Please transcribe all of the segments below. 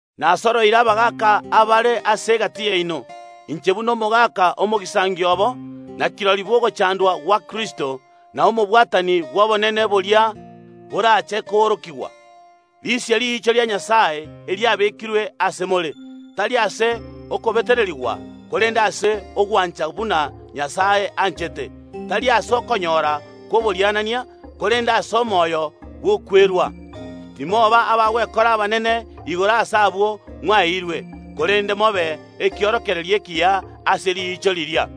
Nasoroire abagaaka abare ase egati yaino, inche buna omogaka omogisangio obo, na kirori bw’ogochandwa gwa Kristo, na omobwatani bw’obonene boria borache koorokigwa: Risia riicho ria Nyasae eriabekirwe ase more, tari ase okobetererigwa korende ase ogwancha buna Nyasae anchete, tari ase okonyora kw’oborianania, korende ase omoyo bw’okwerwa. Timoba abagwekora abanene igoro ase abwo mwaeirwe, korende mobe ekiorokererio ekiya ase riicho riria.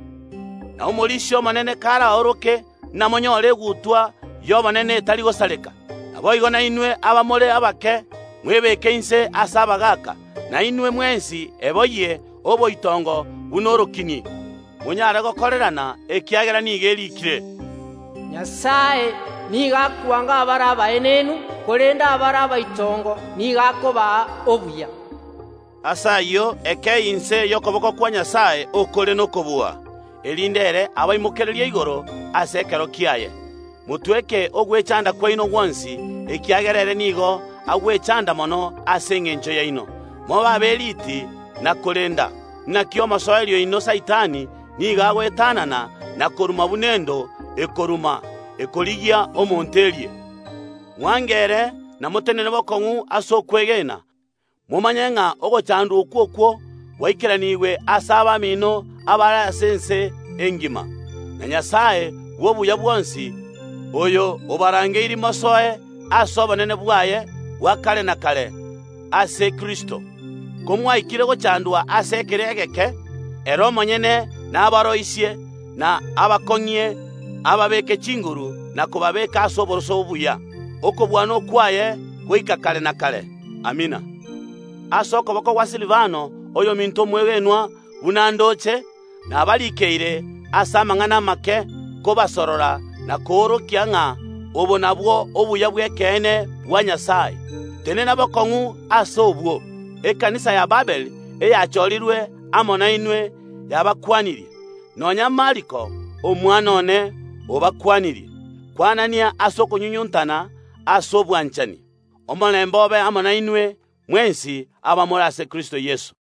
Na Omorisia omonene karaoroke namonyore egutwa y’obonene etari gosareka. Naboigo nainwe abamore abake, mwebeke inse ase abagaaka. Na inwe mwensi eboyie oboitongo buna orokini, monyare gokorerana, ekiagera nigo eriikire, “Nyasae nigo akwanga abare abaenenu, korende abare abaitongo nigo akobaa obuya.” Ase ayio, ekeyie inse y’okoboko kwa Nyasae okore nokobua, erinde ere abaimokererie igoro ase ekero kiaye. Motweke ogwechanda kwaino gwonsi, ekiagera ere nigo agwechanda mono ase engencho yaino. Mobe aberiti na korenda! Naki omosoeri oino Saitani nigo agoetanana na koruma buna endo ekoruma, ekorigia omonto erie. Mwange ere, na motenene bokong’u ase okwegena, momanye ng’a ogochandwa okwo okwo gwaikeranigwe ase abamino abare ase ense engima. Na Nyasae bw’obuya bwonsi, oyo obarangeirie mosoe ase obonene bwaye bwa kare na kare ase Kristo, komwaikire gochandwa ase ekero egeke, ere omonyene nabaroisie, na abakong’ie, ababeeke chinguru na kobabeeka ase oboroso obuya. Okobua nokwaye goika kare na kare. Amina. Ase okoboko gwa Silivano, oyominto omwegenwa buna ndoche, nabarikeire ase amang’ana amake, kobasorora na koorokia ng’a obo nabwo obuya bw’ekeene bwa Nyasae. Tenena bokong’u ase obwo. Ekanisa ya Babiloni eyachorirwe amo nainwe yabakwanirie. Nonya Mariko, omwana one, obakwanirie. Kwanania ase okonyunyuntana ase obwanchani. Omorembe obe amo nainwe mwensi, abamore ase Kristo Yeso.